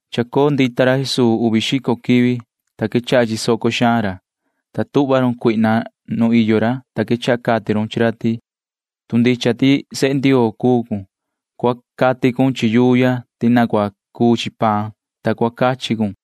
Chacoo ndita ra Jesuu uvi xico quivi. Tacan cuu, ta chisoco ra, ta tuhva run cuihna nu iyo ra, ta quechaha cati run chi ra ti: ―Tu ndicha ti sehe Ndioo cuu cun, cua cati cun chi yuu ya ti cua cuu chi paan, ta cua cachi cun ―cati run.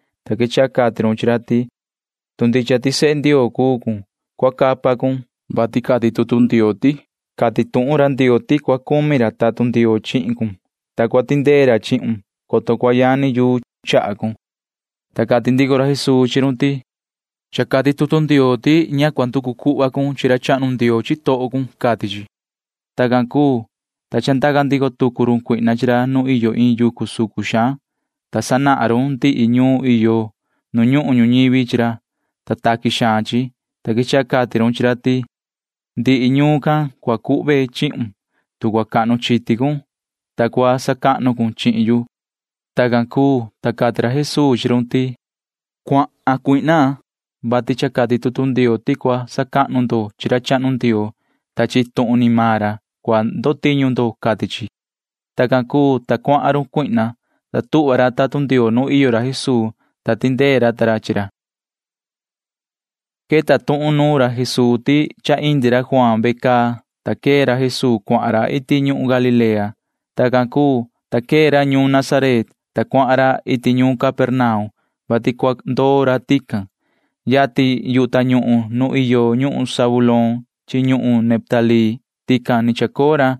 ta quechaha cati run chi ra ti: ―Tu ndicha ti sehe Ndioo cuu cun, cua capa cun, vati cati tutu Ndioo ti: Cati tuhun ra Ndioo ti cua cumi ra tatun Ndioo chi sehe ra, ta cua tindee tatun ra chihin ra, coto cua yani chaha ra chata yuu, cati chi ―cati run. Ta cati ndico ra Jesuu chi run ti: ―Inga ndico cha cati tutu Ndioo ti ña cua nducu ndo cuhva cha cua savaha ra chahnu Ndioo iin cha ndavaha ni, cati chi ―cati ra. Tacan cuu, ta chandaca ndico tucu run cuihna chi ra nu iyo iin yucu sucun xaan, ta sanahan run ndihi ñuun iyo nu ñuhun ñuñivi chi ra, ta taqui xaan chi, ta quechaha cati run chi ra ti: ―Ndihi ñuun can cua cuhve chihun, tu cua cahnu chiti cun, ta cua sacahnu cun chihin yu ―cati run. Tacan cuu, ta cati ra Jesuu chi run ti: ―Cuahan, yoho Satanaa, vati cha cati tutu Ndioo ti cua sacahnu ndo chi ra chahnu Ndioo. Iin tuhun ni maan ra cua sacahnu ndo, cati chi ―cati ra. Tacan cuu, ta cuahan run cuihna, ta tuhva ra tatun Ndioo nu iyo ra Jesuu, ta tindee ra ta ra chi ra. Queta tuhun nuun ra Jesuu ti cha ni tiin tiñu chi ra Juaan, ta quee ra Jesuu cuahan ra iti ñuhun Galilea. Tacan cuu, ta quee ra ñuun Nazaret, ta cuahan ra iti ñuun Capernaum, vati cua ndoo ra tican. Yatin yu tañuhun nu iyo ñuhun Zabulón chi ñuhun Neftalí tican ni chacoo ra.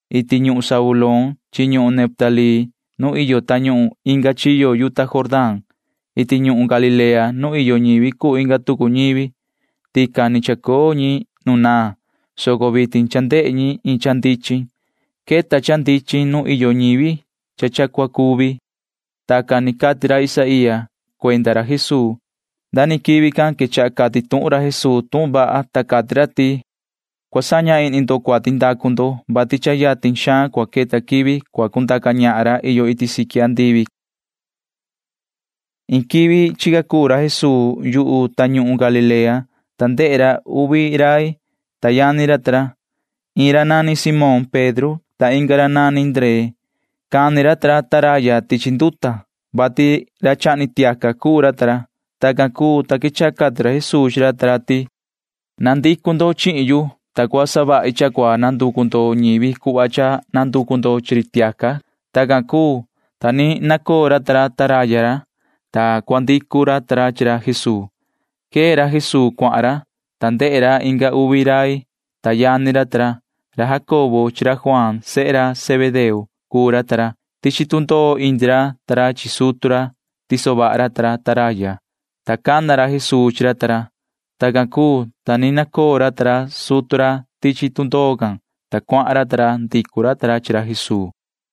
Iti ñuhun Zabulón, iti ñuhun Neftalí nu iyo tañuhun inga chiyo yuta Jordán, iti ñuhun Galilea nu iyo ñivi cuu inga tucu ñivi, tican ni chacoo ñi nu naan, soco vitin cha ndehe ñi iin cha ndichin vaha. Cha queta iin cha ndichin nu iyo ñi chi ndavaha ni. [Tacan ni cati ra Isaía can cuenda ra Jesuu.] Nda ni quivi can quechaha cati tuhun ra Jesuu tuhun vaha, ta cati ra ti: ―Cua saña ihni ndo cuati ndacu ndo, vati yatin xaan cua queta quivi cua cundaca ñahan ra iyo iti siqui andivi ―cati ra. Iin quivi chica cuu ra Jesuu yu tañuhun Galilea can, ta ndehe ra uvi rai, ta mani yani ra ta ra. Iin ra nani Simón Pedro, ta inga ra yani ra nani Ndree. Cani ra ta ra taraya ra tichi nduta can, vati ra chahni tiaca cuu ra ta ra. Tacan cuu, ta quechaha cati ra Jesuu chi ra ta ra ti: ―Na coho. Cua coo ndo chihin yu, ta cua savahi cha cua nanducu ndo chi ñivi cuhva ni nanducu ndo chi ri tiaca ―cati ra. Tacan cuu, ta ni nacoo ra ta ra taraya ra, ta cuahan ra, ta ndicu ra ta ra chi ra Jesuu. Quee ra Jesuu cuahan ra, ta quechaha ndehe ndico tucu ra inga uvi rai, ta mani yani ra ta ra. Ra Jacobo sehe ra Zebedeo cuu ra chi ra Juaan yani ra. Ni iyo ra ta ra chi Zebedeo sutu ra tichi tundoo, ta tiso vaha ra ta ra taraya ra, ta cana ra Jesuu chi ra ta ra. Tacan cuu, ta ni nacoo ra ta ra sutu ra tichi tundoo can, ta cuahan ra ta ra. Ndicu ra ta ra chi ra Jesuu.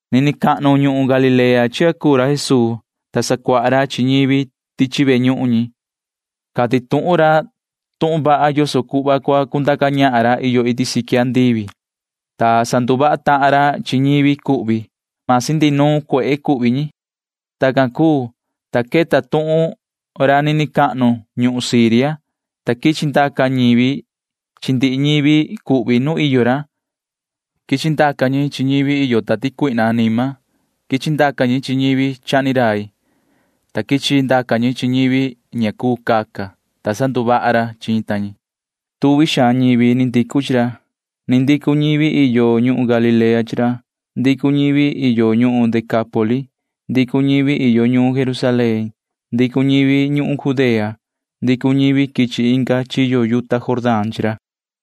Nini cahnu ñuhun Galilea can cuahan ra Jesuu, ta sacuaha ra chi ñivi tichi ve ñuhun ñi. Cati tuhun ra tuhun vaha yoso cuhva cua cundaca ñahan ra iyo iti siqui andivi, ta sanduvaha tahan ra chi ñivi cuhvi―masi cuhvi ñi ndihi nuun cuehe. Tacan cuu, ta queta tuhun ra nini cahnu ñuhun Siria, ta quichi ndaca ñivi chi ndihi ñivi cuhvi nu iyo ra. Ndaca ñi chi ñivi iyo tati cuihna anima. Ndaca ñi chi ñivi chahni rai. Ndaca ñi chi ñivi ña cuu caca. Ndaca ñi, ta sanduvaha ra chi ñi. Tuvi xaan ñivi ndicu chi ra. Ndicu ñivi iyo ñuhun Galilea chi ra. Ndicu ñivi iyo ñuhun Decápoli. Ndicu ñivi iyo ñuun Jerusalén. Ndicu ñivi ñuhun Judea. Ndicu ñivi quichi inga chiyo yuta Jordán. Ndicu ñi chi ra.